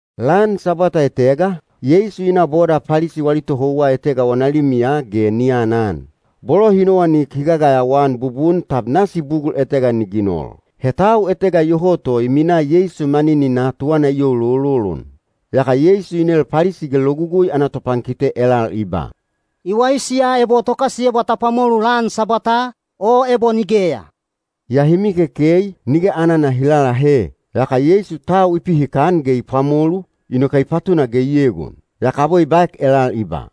Lan Sabwata etega, Yeisu i na boda Palisi wali tohouwa etega wana limiya ge ni anan. Bolo hi nowanik hi gagayawa-an bubun tab nasi bugul etega ni ginol. He tau etega iyoho to i minaa Yeisu manininaa tuwana i youlololon. Yaka Yeisu i nel Palisi ge Logugui ana topankite elal i ba, “I waisi ya ebo tokasiyebwa ta pwamolu lan Sabwataa, o ebo nigeya?” Yaa hi mikekei, nige anana hi lalahe. Yaka Yeisu tau i pihikan ge i pwamolu, inoke i patuna ge i egon. Yaka abwe i baek elal i ba,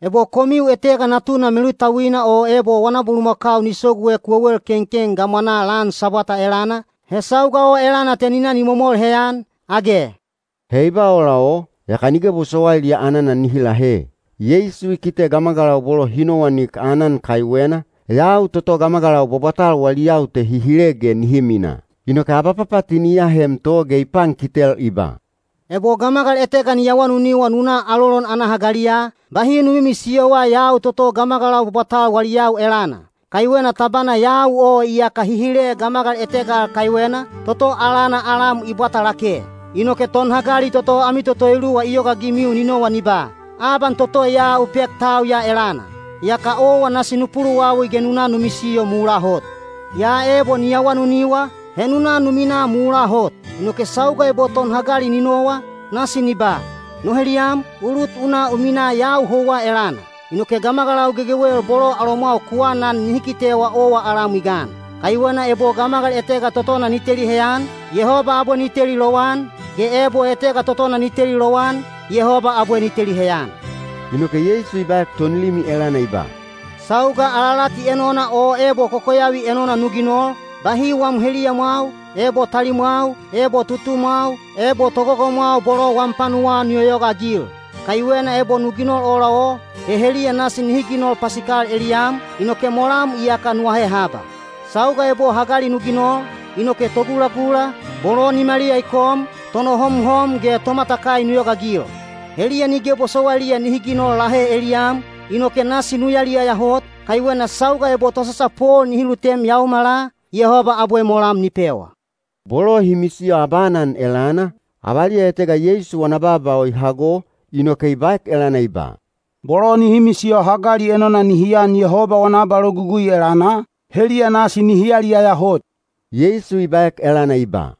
“Ebo komiu etega natuna melutauina o ebo wana bulumakau ni soguek wewel kenken gamwanaa lan Sabwata elana, he sauga o elana te ni na ni momol heyan, age?” He i ba ola o, yaka nige bosowailiya anana nihi lahe. Yeisu i kite gamagalau bolo hi nowanik aanan kaiwena, yau toto gamagalau bwabwatal wali yau te hi hile ge nihi minaa. Inoke abapapatini i ahem to ge i pankitel i ba, “Ebo gamagal etega ni awanuniwa nu na alolon ana hagaliya, bahi nu mimisiyowa yau toto gamagalau bwabwatal wali yau elana. Kaiwena tabana yau o iyaka hi hile gamagal etega al kaiwena, toto alana alam i bwata lake. Inoke tonhagali toto ami toto eluwa i yogaagimiu ni nowa ni ba, ‘Aban toto ya u pek tau ya elana.’ Yaka owa nasi nu puluwawi ge nu na nu misiyo mulaa hot. Yaa ebo ni awanuniwa, he nu na nu minaa mulaa hot. Inoke sauga ebo tonhagali ni nowa, nasi ni ba, ‘No heliyam, u lut u na u minaa yau houwa elana.’ Inoke gamagalau gegewel bolo alomwau ku anan nihi kitewa owa alam i gan. Kaiwena ebo gamagal etega totona ni teli heyan, Yehoba abwe ni teli lowan, ge ebo etega totona ni teli lowan, Yehoba abwe ni teli heyan.” Inoke Yeisu i baek tonlimi elana i ba, “Sauga alalati enona o ebo kokoyavi enona nu ginol, bahi wam heliyamwau, ebo talimwau, ebo tutumwau, ebo togogomwau bolo wam panuwaa nu yoyogaagil. Kaiwena ebo nu ginol ola o, he heliya nasi nihi ginol pasikal eliyam, inoke molam iyaka nu ahe haba. Sauga ebo hagali nu ginol, inoke togulagula, bolo nimaliya i kom, tonohomhom ge tomatakai nu yogaagil. Heliya nige bosowailiya nihi ginol lahe eliyam, inoke nasi nu yaliyaya hot, kaiwena sauga ebo tosasapol nihi lutem yaomala, Yehoba abwe molam ni pewa.” Bolo hi misiyo abaanan elana, avaliya etega Yeisu wana baaba o i hago, inoke i baek elana i ba, “Bolo nihi misiyo hagali enona nihi an Yehoba wana abalogugui elana, heliya nasi nihi yaliyaya hot.” Yeisu i baek elana i ba,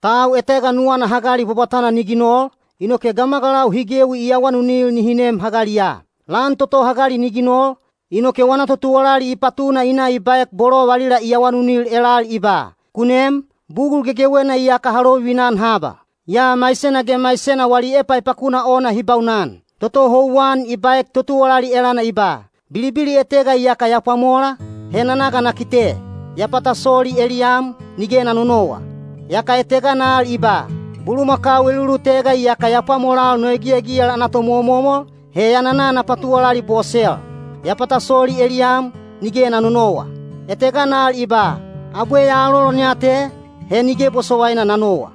“Tau etega nuwana hagali bwabwatana ni ginol, inoke gamagalau hi gewi i awanunil nihi nem hagaliya. Lan toto hagali ni ginol, inoke wana totuwalali i patuna i na i baek bolo valila i awanunil elal i ba, ‘Ku nem, bugul gegewena iyaka ha lovivina-an haba.’ Yaa maisena ge maisena wali epaepakuna ona hi baunan. Toto houwan i baek totuwalali elana i ba, ‘Bilibili etega iyaka ya pwamola, he na na ga na kite. Ya pata soli eliyam, nige na nonowa.’ Yaka etegana al i ba, ‘Bulumakau elulutega iyaka ya pwamolal no egiyagiyal ana tomomomol, he ya nana na patuwalali bosel. Ya pata soli eliyam, nige na nonowa.’ Etegana al i ba, ‘Abwe ya alolon ya te, he nige bosowaina na nowa.’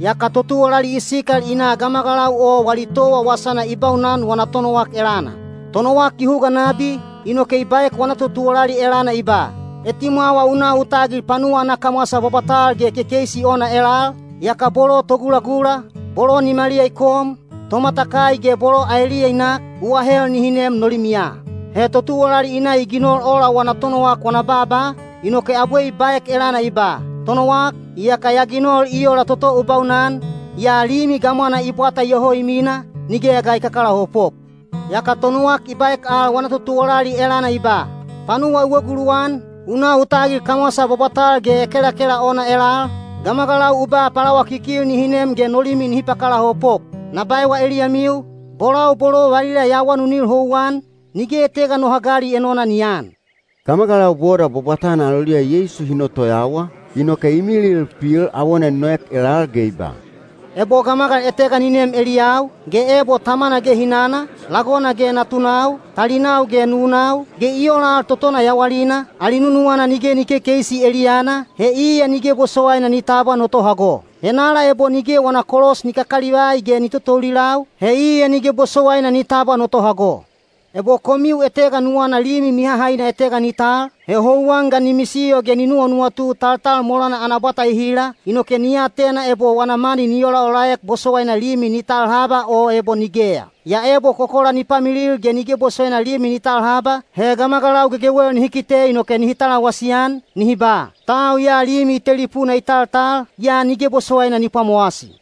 Yaka totuwalali i sikal i na gamagalau o wali towa wasana i baunan wana tonowak elana. Tonowak i huga nabi, inoke i baek wana totuwalali elana i ba, ‘Etimwawa u na u tagil panuwa ana kamwasa bwabwatal ge kekeisi ona elal, yaka bolo togulagula, bolo nimaliya i kom, tomatakai ge bolo aeliya i nak, u ahel nihi nem no limiya.’ He totuwalali i na i ginol ola wana tonowak wana baaba, inoke abwe i baek elana i ba, ‘Tonowak, iyaka ya ginol i ola toto u baunan, yaa limi gamwana i bwata iyoho i mina, nigeya ga i kakalaopop.’ Yaka tonowak i baek al wana totuwalali elana i ba, ‘Panuwa u eguluwan, u na u tagil kamwasa bwabwatal ge ekelakela ona elal, gamagalau u ba palawakikil nihi nem ge no limi nihi pakalaopop. Na baewa eliyamiu, bolau bolo valila ya awanunil houwan, nige etega no hagali enona ni aan.’” Gamagalau boda bwabwatana aloliya Yeisu hi notoyawa, inoke i milil pil awona i noek elal ge i ba, “Ebo gamagal etega ni nem eliyau, ge ebo tamana ge hinana, lagona ge natunau, talinau ge nunau, ge i ola al totona yawalina, ali nunuwana nige ni kekeisi eliyana, he iya nige bosowaina ni tabwa no tohago. Henala ebo nige wana kolos ni kakalivai ge ni totoulilau, he iya nige bosowaina ni tabwa no tohago. Ebo komiu etega nuwana limi mihahaina etega ni tal, he houwan ga ni misiyo ge ni nuwanuwatu taltal molana ana bwata ehila, inoke ni atena ebo wana mani ni olaolaek bosowaina limi ni tal haba o ebo nigeya. Yaa ebo kokola ni pamilil ge nige bosowaina limi ni tal haba, he gamagalau gegewel nihi kite inoke nihi talawasi-an, nihi ba, ‘Tau ya limi i telipuna i taltal, yaa nige bosowaina ni pwamowasi.’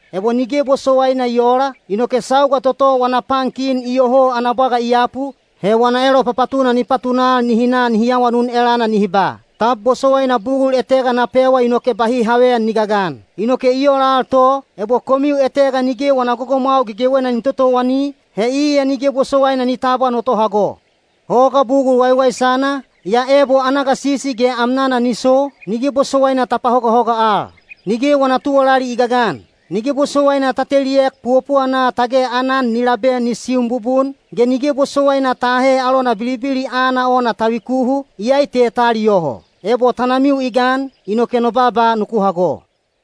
Ebo nige bosowaina i oola, inoke sauga toto wana pan kin iyoho ana bwaga i yapu, he wana elopapatuna ni patunal nihi na nihi awanun elana nihi ba, ‘Tab bosowaina bugul etega na pewa inoke bahi haveyan ni gagan?’ Inoke i ola al to, ebo komiu etega nige wana gogomwau gegewena ni totowani, he iya nige bosowaina ni tabwa no tohago. Hoga bugul waiwaisana, yaa ebo ana gasisi ge amnana ni so, nige bosowaina ta pahogahoga al. Nige wana tuwalali i gagan. Nige bosowaina ta teliek puwapuwana tage aanan ni labe ni siun bubun, ge nige bosowaina ta ahe alona bilibili aana ona ta vikuhu, iyai te ta aliyoho. Ebo tanamiu i gan, inoke no baaba nuku hago.”